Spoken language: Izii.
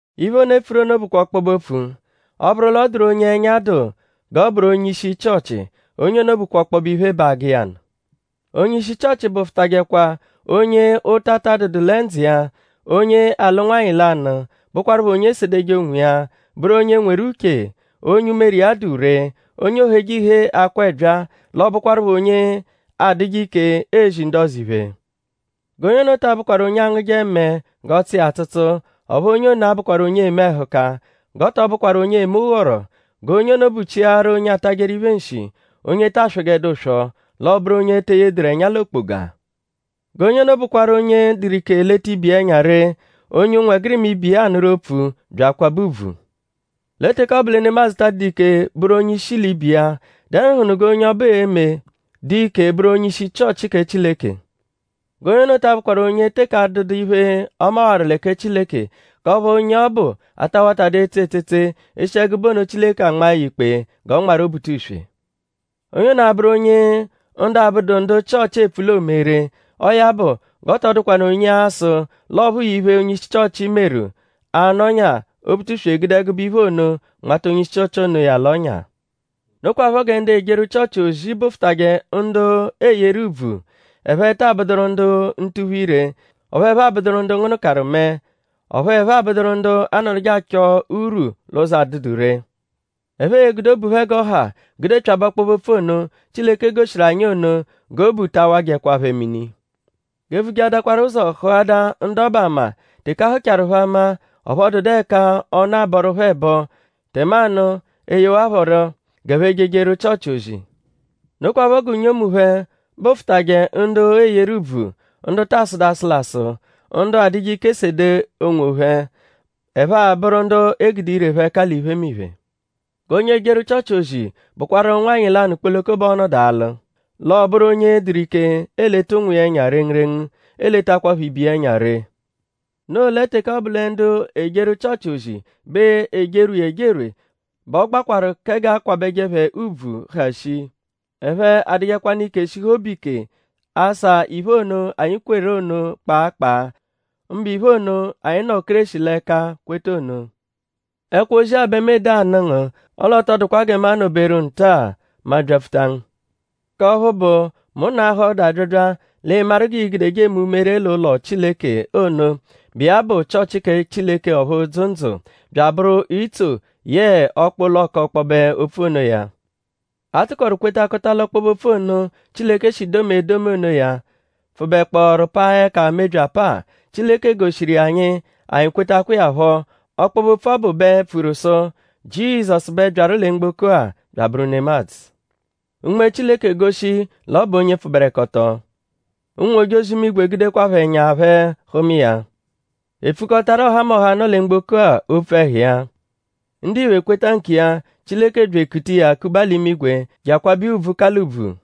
Iphe ono, e pfuru ono bụkwa ọkpobe-opfu: “Ọ -bụru l'ọ dụru onye ẹnya dụ g'ọ bụru onye-ishi Chịochi; onye ono bụkwa ọkpobe iphe bẹ agụ iya nụ.” Onye-ishi Chịochi bụfutajekwa onye ụta adụdu lẹ ndzụ iya; onye alụ nwanyị lanụ; bụkwarupho onye esedeje onwiya; bụru onye nweru uche; onye umere iya dụ ree; onye ooheje ihee akwa ẹbyaa; l'ọ bụkwarupho onye adụje ike ezi ndu ọzo iphe. G'onye ono ta abụkwaru onye angụje mẹe g'ọ tsụ iya atsụtsu; ọphu onye ono abụkwaru onye eme ẹhuka. G'ọ tọ bụkwaru onye eme ụghoro. G'onye ono buchiaru onye atajẹru iphe nshi; onye ta aswọjedu ụswo; l'ọ bụru onye te eyeduru ẹnya l'okpoga. G'onye ono bụkwaru onye dụru ike leta ibe iya ẹnya ree; onye ụnwegirima ibe iya anụru opfu bya akwabẹ ùbvù. Lẹ teke ọ bụ lẹ nemadzụ ta adụdu ike bụru onye-ishi l'ibe iya;?dẹnuhunu g'onye ọbu e-me dụ ike bụru onye-ishi Chịochi kẹ Chileke? G'onye ono ta abụkwaru onye teke adụdu iphe, ọ mawaru lẹ kẹ Chileke; k'ọphu onye ọbu ata watadu etse etsetse; eshi ẹgube ono Chileke anmaa ya ikpe g'ọ nmarụ Obutuswe. Onye ono abụru onye ndu abụdu ndu Chịochi epfu l'oome ree; ọo ya bụ g'ọ tọ dụkwanu onye a-sụ l'ọ phụu iphe, onye-ishi Chịochi meru; a -nọnyaa Obutuswe gude ẹgube iphe ono nmata onye-ishi onoya l'ọ́nyà. Nokwaphọ gẹ ndu ejeru Chịochi ozi bụfutaje ndu eeyeru ùbvù. Ẹphe taa bụduru ndu ntuphu-ire; ọphu ẹphe abụduru ndu ngụnukaru mẹe; ọphu ẹphe abụduru ndu anọduje achọ urwu l'ụzo adụdu ree. Ẹphe e-gude obu phẹ g'ọ ha gudepyabẹ ọkpobe-opfu ono, Chileke goshiru anyi ono; g'obu ta awajẹkwa phẹ mini. G'e vujeadakwaru ụzo hụadaa ndu ọbu ama; teke a hụchaaru phẹ ama; ọphu ọ dụdu ẹka ọnu abọru phẹ ẹbo; tẹmanu e yewa phẹ rọ g'ẹphe jejeru Chịochi ozi. Nokwaphọ gẹ unyomu phẹ bụfutaje ndu eeyeru ùbvù; ndu ta asụdu asụlasu; ndu adụje ike sede onwophẹ; ẹphe abụru ndu e gude ire phẹ ẹka l'iphemiphe. G'onye ejeru Chịochi ozi bụkwaru nwanyị lanụ kpoloko bẹ ọo-nọdu alụ. L'ọ bụru onye dụru ike eleta ụnwu iya ẹnya rengurengu; eletakwaphọ ibe iya ẹnya ree. Noo lẹ teke ọ bụ lẹ ndu ejeru Chịochi ozi bẹ ejerwe iya ejerwe bẹ ọ gbakwarụ kẹ g'a kwabẹje phẹ ùbvù, ha shii. Ẹphe adụjekwanu ike shihu obu ike asa iphe ono, anyi kweru ono kpaa kpaa; mbụ iphe ono, anyi nọ Kéreshi l'ẹka kweta ono. Ẹkwo-ozi-a bẹ mu ede anụ ngu; ọle ọ tọ dụkwa gẹ mu anọ-beru nta-a mu abyapfuta ngu; k'ọphu bụ; mu -nọahaa ọdu abyabya l'ịi-maru g'i-gudeje eme umere l'ụlo Chileke ono, bụ iya bụ Chịochi kẹ Chileke ọphu dzụ ndzụ; bya abụru itso yẹe ọkpa-ụlo k'ọkpobe-opfu onoya. A tụkoru kwetakọta l'ọkpobe-opfu ono, Chileke shi domia edomi onoya pfụbekpooru paa ẹka mebyi apaa. Chileke goshiru iya anyi; anyi kwetakwa iya phọ. Ọkpobe-opfu ọbu bẹ pfuru sụ: Jizọsu bẹ byaru lẹ mgboko-a bya abụru nemadzụ. Unme Chileke goshi l'ọ bụ onye pfụberekoto. Ụnwu-ojozi-imigwe gudekwaphọ ẹnya phẹ hụma iya. E pfukọtaru ọhamoha, nọ lẹ mgboko opfu ẹhu iya. Ndiphe kweta nkiya; Chileke bya ekuta iya kuba l'imigwe je akwabẹ iya ùbvù, ka l'ùbvù.